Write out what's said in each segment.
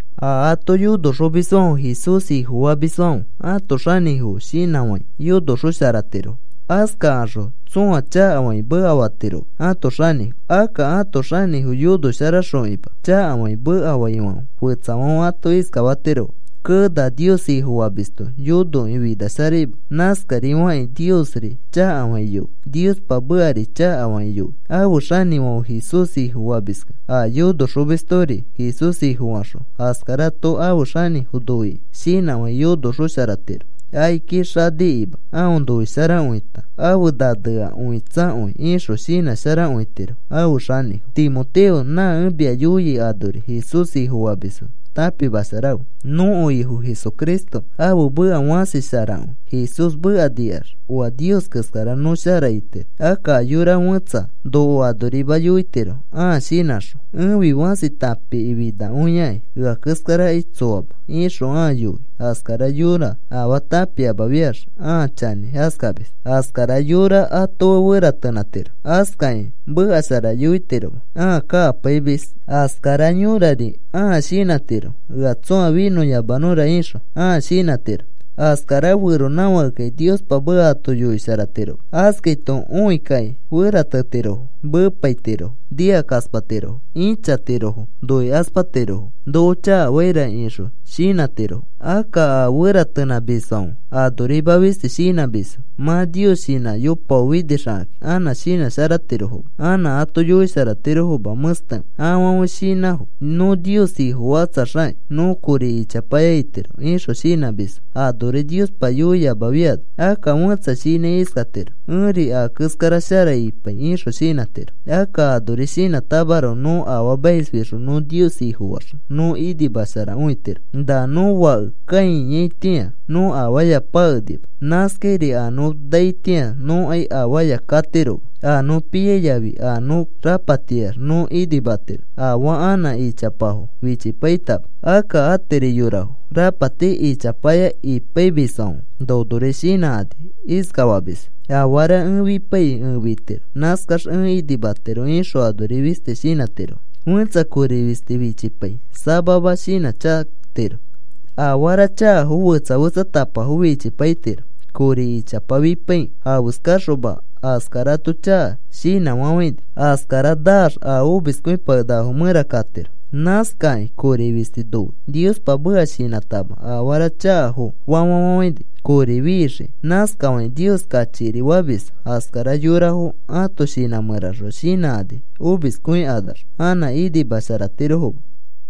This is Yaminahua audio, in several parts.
A ato yonoxomisfãfe Jesús Ifofamisfãfe ãto xanĩfo shinãfãi yonosharaxotirofo. Askakaxõ tsõa chakafakĩ mekafatiroma ãto xanĩfo. Akka ãto xanĩfo yonosharaxokima chakafakĩ mekafaifãfe fetsafãfe ato iskafatirofo: “Kee, na Nios Ifofamisto yonokĩ finasharaima.” Nãskarifakĩ Niosri chakafakĩ yoi. Niospa mekari chakafakĩ yoi. Ãfe xanĩfãfe Jesús Ifofamiskẽ a yonoxomistori Jesús Ifofaxõ askarato ãfe xanĩfo noikĩ shinãfãi yonosharaxotiro, akiki xanikima aõ noisharakõita afe nanea õitsakõi ixõ shinãsharakõitiro ãfe xanĩfo. Timoteo, nã ẽ mia yoiai anori Jesús Ifofamisfo tãpimasharafe. Nõko Ifo Jesucristo ãfe meka fãsisharakõi. Jesús meka nikax oa Nios keskara nõ shara itiro. Akka a yora fẽtsa noko anorima yoitiro, ãa shinãxõ. “Ẽfi fãsi tãpifinakõiakĩ, ea keskarakai tsoama,” ixõ ãa yoi askara yõra afaa tãpiamafiax. Ãa chanĩ askamis. Askara yora ato fe feratenãtiro. Askakĩ meka shara yoitiroma. Ãa kakapaimis askara yõrari ãa shinãtiro: “Ea tsõa finõyamanõra,” ixõ ãa shinãtiro. Askara feronãfãkekai Niospa meka ato yoisharatiroma. Askaito õi kakĩ feratetirofo, meepaitirofo, nikakaspatirofo, ĩchatirofo, noikaspatirofo, “Noko chakafaira,” ixõ shinãtirofo. Akka a feratenãmisfãfe anorima fisti shinãmisfo. Mã Nios shinãyopaofinixakakĩ anã shinãsharatirofoma. Anã ato yoisharatirofoma mẽstekõi. Afãfe shinãfo: “Nõ Nios Ifofakatsaxakĩ nõ kori ichapaya itiro,” ixõ shinãmisfo anori Niospa yoiamafiano. Akka fẽtsa shinãi iskatiro: “Ẽri a keskara shara ipai,” ixõ shinãtiro. Akka anori shinãtamaroko nõ afaamaisfixõ nõ Nios Ifofaax, nõ inimasharakõitiro. Na nõ fake kãiyaitĩa nõ afaaya pakenima. Nãskairi a nõ naitĩa nõkai afaaya katiroma. A nõ piai yafi a nõ rapatiyax nõ inimatiro, afaa anã ichapafo fichipaitama. Akka atiri yorafo rapati ichapaya ipaimisfãfe nonori shinãkani iskamisfo: “Afara ẽ fipaikĩ ẽ fitiro, nãskax ẽ inimatiro,” ixõ anori fisti shinãtiro. Fẽtsa kori fisti fichipai samama shinãchakatiro, afara chakafo fetsa fetsatapafo fichipaitiro. Kori ichapa fipaikĩ afeskaxoma askarato chaka shinãfafãini. Askara naax, a omiskõipakenakafo mẽra katiro. Nãskakĩ kori fisti noi, Niospa meka shinãtama afara chakafofa fafafãini kori fixikĩ. Nãskafakĩ Nios kachikiri famisfo. Askara yorafo ãto shinã mẽraxõ shinãkani omiskõikanax anã inimasharatirofoma.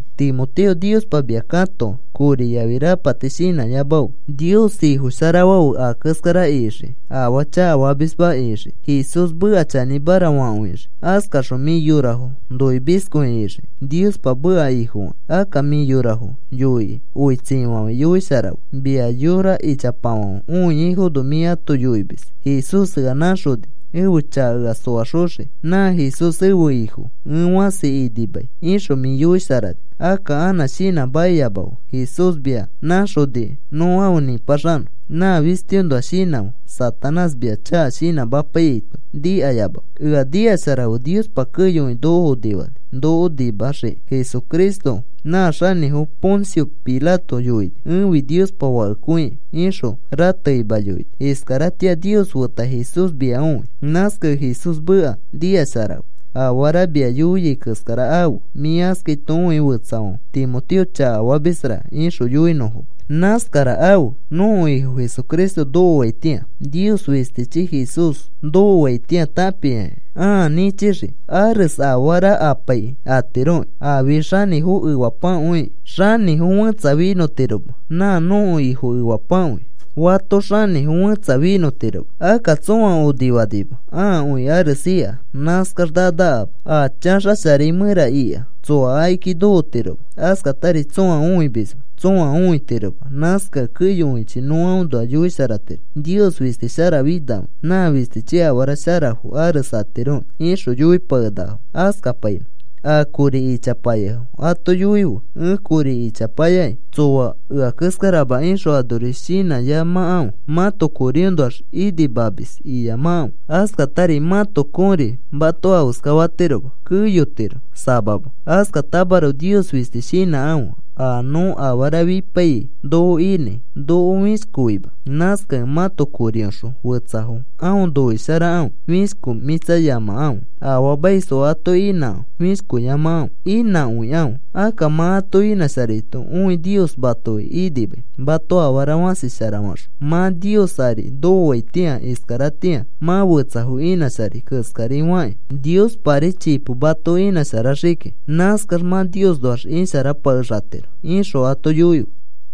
Timoteo, Niospa mia katoa. Kori yafi rapati shinãyamafe. Nios Ifofasharafe a keskara ixiki, afaa chakafamisma ixiki, Jesús meka chanĩmara fakõixiki. Askaxõ mĩ yorafo noimiskõi ixiki, Niospa meka Ifofakĩ, akka mĩ yorafo yoikĩ oitsifafãi yoisharafe. Mia yora ichapafãfe õiaifono mĩ ato yoimis: “Jesús ea nãxoni ẽfe chaka ea soaxoxiki. Nã Jesús ẽfe Ifo. Ẽ fãsi inimai,” ixõ mĩ yoisharani. Akka anã shinãmakiyamafe. Jesús mia nãxoniki nõ afe nĩpaxanõ. Nã fistiõnoa shinãfe. Satanás mia chaka shinãmapaiyaito nikayamafe. Ea nikasharafe Niospa keyokõi noko onifani noko nimaxiki. Jesucristo nã xanĩfo Poncio Pilato yoini: “Ẽfi Niospa Fakekõi,” ixõ ratekima yoini. Iskaratĩa Nios feta Jesús mia õi. Nãskakẽ Jesús meka nikasharafe. Afara ẽ mia yoiai keskara afe, mĩ askaito õikĩ fetsafãfe, “Timoteo chakafamisra,” ixõ yoinõfoma. Nãskara afe nõko Ifo Jesucristo nokoaitĩa. Nios fistichi Jesús nokoaitĩa tãpiakĩ ãa nĩchixiki. Ares afara apaikĩ atiroki. Afi xanĩfo efapakõiki xanĩfo fẽtsa finõtiroma. Nã nõko Ifo efapakõi fato xanĩfo fẽtsa finõtiroma. Akka tsõa onifanima, aakõi ares ika. Nãskax nanakama. A chaxasharai mẽra ika tsoa akiki nokotiroma. Askatari tsõa õimisma, tsõa õitiroma. Nãskakẽ keyokõichi nõ aõnoa yoisharatiro: “Nios fisti sharafinakõia. Nã fistichi afara sharafo ares atiroki,” ixõ yoipakenakafo. Askapainõ. A kori ichapayafo ato yoife: “ ‘Ẽ kori ichapayaki tsoa ea keskarama,’ ixõ anori shinãyamakãfe. Mãto koriõnoax inimamis iyamakãfe. Askatari mãto kori mato afeskafatiroma, keyotiro samama. Askatamaroko Nios fisti shinãkãfe. A nõ afara fipaiyai noko inãi noko fĩshkoima. Nãskakẽ mãto korioxõ fetsafo aõ noisharakãfe. Fishkomĩtsayamakãfe. Afaamaisfo ato inãkãfe. Fishkoyamakãfe. Inãkõikãfe. Akka mã ato inãsharaito õi Nios matoki inimai. Mato afara fãsi shara faxõi mã Nios ari nokoaitĩa. Iskaratĩa mã fetsafo inãsharai keskari fakĩ, Niospari chipo mato inãsharaxii kiki. Nãskax mã Niosnoax isharapakexatiro,” ixõ ato yoife.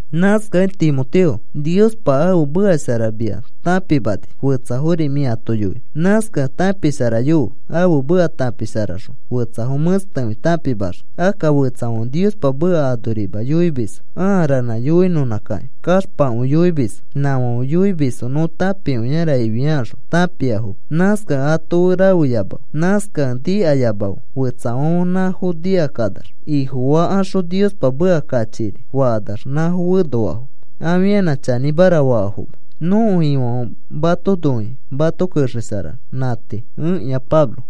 Nãskakẽ Timoteo, Niospa ãfe meka shara mia tãpimani fetsafori mĩ ato yoinõ. Nãskakẽ tãpisharayofe, ãfe meka tãpisharaxõ fetsafo mẽstekõi tãpimaxii. Akka fetsafãfe Niospa meka anorima yoimisfo. Aa ranã yoinõnãkakĩ kaxpakõi yoimisfo. Nãfãfe yoimisfo nõ tãpikõiara ifiakaxõ tãpiafoma. Nãskakẽ ato fe rafeyamafe. Nãskakẽ nikayamafe. Fetsafãfe nãfo nikakanax ifofakaxõ Niospa meka kachikiri fakanax, nãfo fenoafo. Afianã chanĩmara faafoma. Nõko Ifofãfe mato noikĩ mato kexesharanõ. Nã tii. Ẽkĩa Pablo.